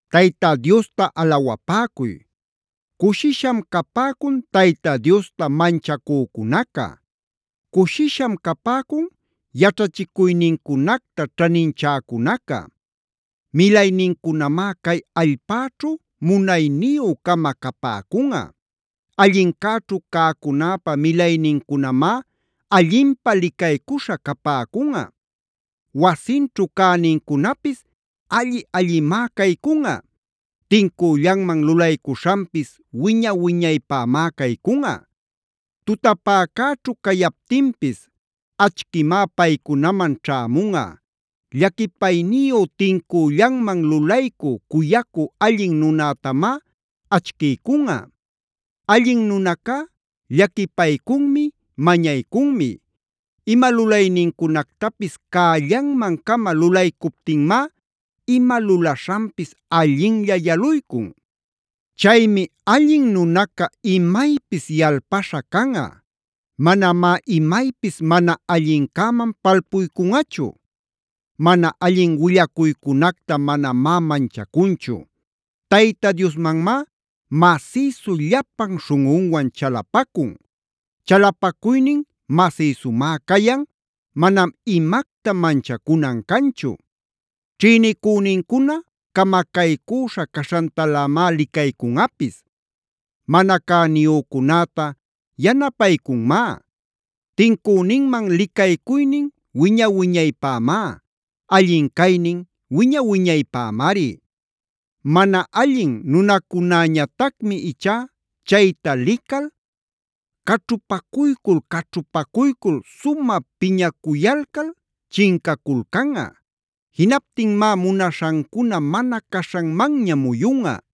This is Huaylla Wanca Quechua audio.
Tayta Diosta alawapäcuy. Cushisham capäcun Tayta Diosta manchacücunaca. Cushisham capäcun yaćhachicuynincunacta ćhaninchäcunaca. Milaynincunamá cay allpäćhu munayniyü-cama capäcunꞌa. Allincäćhu cäcunäpa milaynincunamá allinpä licaycuśha capäcunꞌa. Wasinćhu cänincunapis alli-allimá caycunꞌa. Tincüllanman lulaycuśhanpis wiña-wiñaypämá caycunꞌa. Tutapäcäćhu cayaptinpis achquimá paycunaman ćhämunꞌa. Llaquipayniyu, tincüllanman lulaycü, cuyacü allin nunätamá achquiycunꞌa. Allin nunacá llaquipaycunmi, mañaycunmi. Ima lulaynincunactapis cällanman-cama lulaycuptinmá ima lulaśhanpis allinlla yaluycun. Chaymi allin nunaca imaypis yalpaśha canꞌa. Manamá imaypis mana allincäman palpuycunꞌachu. Mana allin willacuycunacta manamá manchacunchu. Tayta Diosmanmá masïsu llapan śhunꞌunwan chalapacun. Chalapacuynin masïsumá cayan, manam imacta manchacunan canchu. Ćhïnicünincuna camacaycüśha caśhantalämá licaycunꞌapis. Mana cäniyücunäta yanapaycunmá. Tincüninman licaycuynin wiña-wiñaypämá. Allin caynin wiña-wiñaypämari. Mana allin nunacunäñatacmi ichá chayta lical, caćhupacuycul-caćhupacuycul sumä piñacuyalcal chincaculcanꞌa. Jinaptinmá munaśhancuna mana caśhanmanña muyunꞌa.